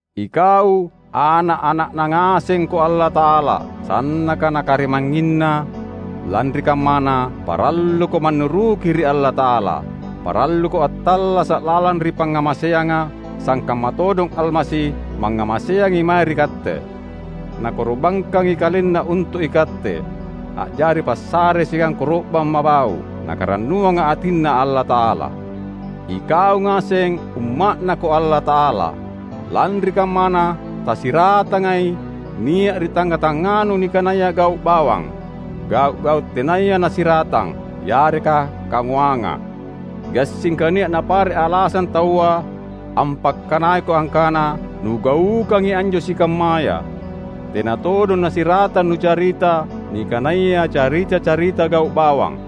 Ikau ana’-ana’Na ngasengko Allata’ala, sannaka Nakarimangnginna; lanri kammana, paralluko mannuruki ri Allata’ala. Paralluko attallasa’ lalang ri pangngamaseanga, sangkamma todong Almasi mangngamaseangi mae ri katte. Nakoro’bangkangi KalenNa untu’ ikatte, a’jari passare siagang koro’bang mabau’, Nakarannuanga atinNa Allata’ala. Ikau ngaseng Umma’Nako Allata’ala. Lanri kammana, tasiratangai nia’ ri tangnga-tangnganu nikanaya gau’ bawang, gau’-gau’ tenaya nasiratang, yareka kangoanga. Gassingka nia’ napare’ alasang taua ampakkanaiko angkana nugaukangi anjo sikammaya. Tena todong nasiratang nucarita nikanaya carita-carita gau’ bawang,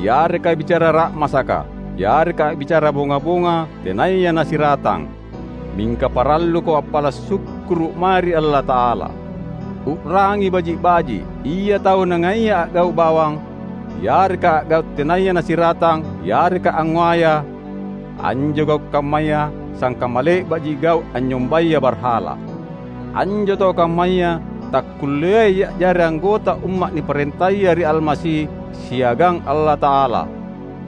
yareka bicara ra’masaka, yareka a’bicara bonga-bonga tenaya nasiratang. Mingka paralluko appala’ sukkuru’ mae ri Allata’ala. U’rangi baji’-baji’: ia tau nangaia a’gau’ bawang, yareka a’gau’ tenaya nasiratang yareka angngoaya (anjo gau’ kammaya sangkamma le’ba’ji gau’ anynyombaya barhala), anjo tau kammaya takkulleai a’jari anggota umma’ niparentaya ri Almasi siagang Allata’ala.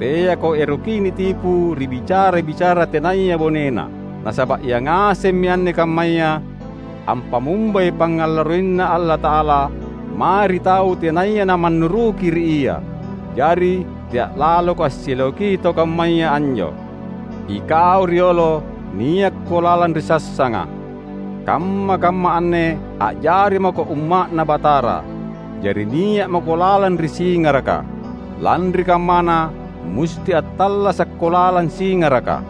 Teako erokki nitipu ri bicara-bicara tenaya bonena. Nasaba’ ia ngasemmi anne kammaya ampammumbai pangngalarroiNa Allata’ala mae ri tau tenaya namannuruki ri Ia. Jari, tea’ laloko assileoki tau kammaya anjo. Ikau riolo niakko lalang ri sassanga. Kamma-kamma anne a’jari mako umma’Na Batara; jari nia’ mako lalang ri singaraka. Lanri kammana, musti attallasakko lalang singaraka.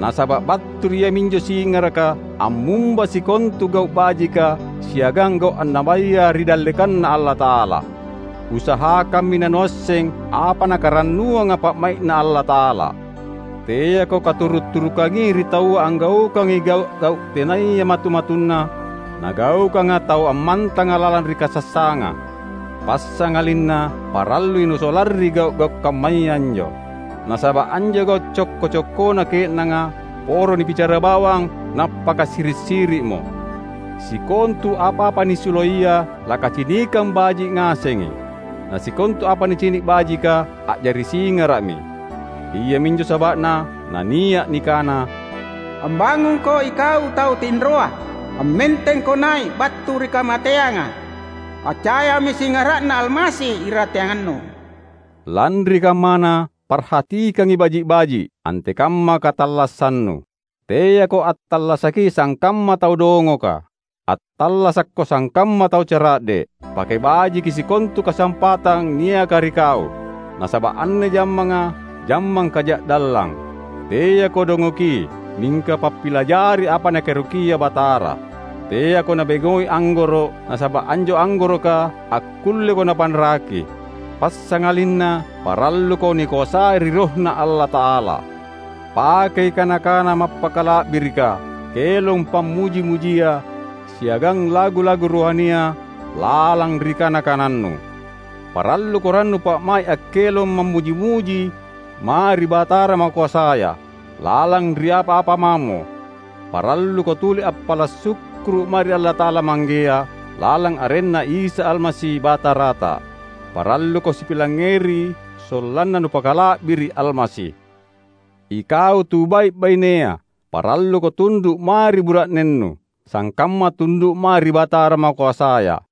Nasaba’ battu ri iaminjo singaraka ammumba sikontu gau’ bajika siagang gau’ annabaya ri dallekanNa Allata’ala. Usahakammi nanuasseng apa Nakarannuanga pa’mai’Na Allata’ala. Teako katuru’-turukangi ri taua anggaukangi gau’-gau’ tenaya matu-matunna nagaukanga tau ammantanga lalang ri kasassanganga. Passangalinna parallui nusolarri gau’-gau’ kammaya anjo. (Nasaba’ anjo gau’ cokko-cokkona ke’nanga, poro nibicarabawang nappakasiri’-siri’mo.) Sikontu apa-apa nisuloiya lakacinikang baji’ ngasengi. Na sikontu apa nicini’ bajika, a’jari singara’mi. Iaminjo saba’na nania’ nikana, "Ambangungko ikau tau tinroa, ammentengko nai’ battu ri kamateanga! Accayami singara’Na Almasi irateangannu." Lanri kammana, parhatikangi baji’-baji’, antekamma katallassannu. Teako attallasaki sangkamma tau dongoka. Attallasakko sangkamma tau cara’de’. Pake bajiki sikontu kasampatang niaka ri kau; nasaba’ anne jammanga, jammang kaja’dallang. Teako dongoki, mingka pappilajari apa Nakaerokia Batara. Teako nabengoi anggoro’, nasaba’ anjo anggoroka akkulleko napanraki. Passangalinna paralluko nikoasai ri RohNa Allata’ala. Pakei kana-kana mappakala’birika, kelong pammuji-mujia siagang lagu-lagu rohania lalang ri kana-kanannu. Paralluko rannu pa’mai’ akkelong mammuji-muji mae ri Batara makoasaya. Lalang ri apa-apa mamo, paralluko tuli appala’ sukkuru’ mae ri Allata’ala Manggea, lalang arenNa Isa Almasi, Batarata. Paralluko sipilangngeri sollanna nupakala’biri’ Almasi. Ikau tu bai’-bainea, paralluko tundu’ mae ri bura’nennu, sangkamma tundu’ mae ri Batara makoasaya.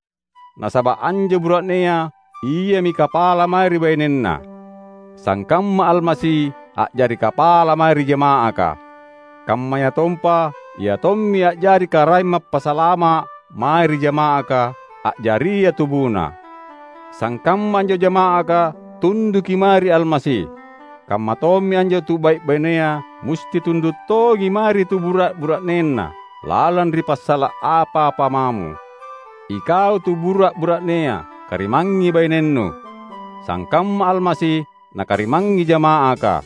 Nasaba’ anjo bura’nea iami kapala mae ri bainenna, sangkamma Almasi a’jari kapala mae ri jama’aka; kammayatompa Ia tommi a’jari Karaeng Mappasalama’ mae ri jama’aka, a’jaria TubuNa. Sangkamma anjo jama’aka tunduki mae ri Almasi, kammatommi anjo tu bai’-bainea musti tundu’ tongi mae ri tubura’-bura’nena, lalang ri passala’ apa-apa mamo. Ikau tubura’-bura’nea, karimangngi bainennu, sangkamma Almasi Nakarimangngi jama’aka.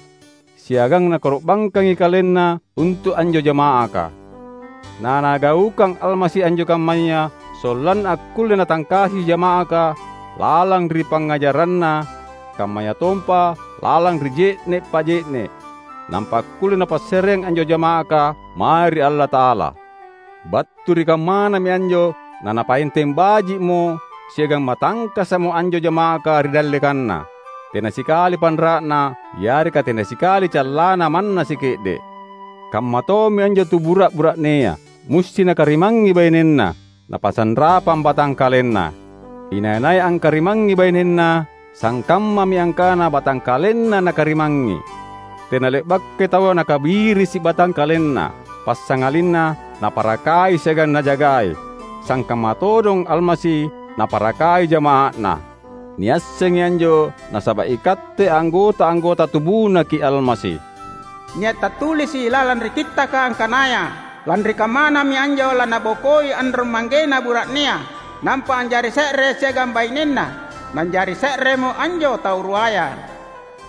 Siagang Nakoro’bangkangi KalenNa untu’ anjo jama’aka. NaNagaukang Almasi anjo kammaya, sollanna akkulle Natangkasi jama’aka lalang ri pangngajaranNa kammayatompa lalang ri je’ne’ pa’je’ne’, nampa akkulle Napassareang anjo jama’aka mae ri Allata’ala. Battu ri kammanami anjo naNapaenteng baji’mo siagang matangkasa’mo anjo jama’aka ri dallekanNa, tena sikali panra’na yareka tena sikali callanna manna sike’de’. Kammatommi anjo tubura’-bura’nea, musti nakarimangngi bainenna, napasanrapang batangkalenna. Inai-nai angkarimangngi bainenna, sangkammami angkana batangkalenna nakarimangngi. (Tena le’bakai taua nakabirisi batangkalenna.Passangalinna naparakai siagang najagai, sangkamma todong Almasi Naparakai jama’aNa; niassengi anjo nasaba’ ikatte anggota-anggota tubuNaki’ Almasi.) Nia’ tattulisi’ lalang ri Kittaka angkanaya, "Lanri kammanami anjo nalanabokoi anrong-manggena bura’nea, nampa a’jari se’re siagang bainenna, nanjari se’remo anjo tau ruaya."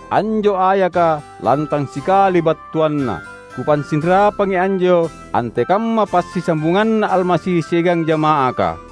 Anjo ayaka lantang sikali battuanna. Kupasinrapangi anjo antekamma passisambunganNa Almasi siagang jama’aka.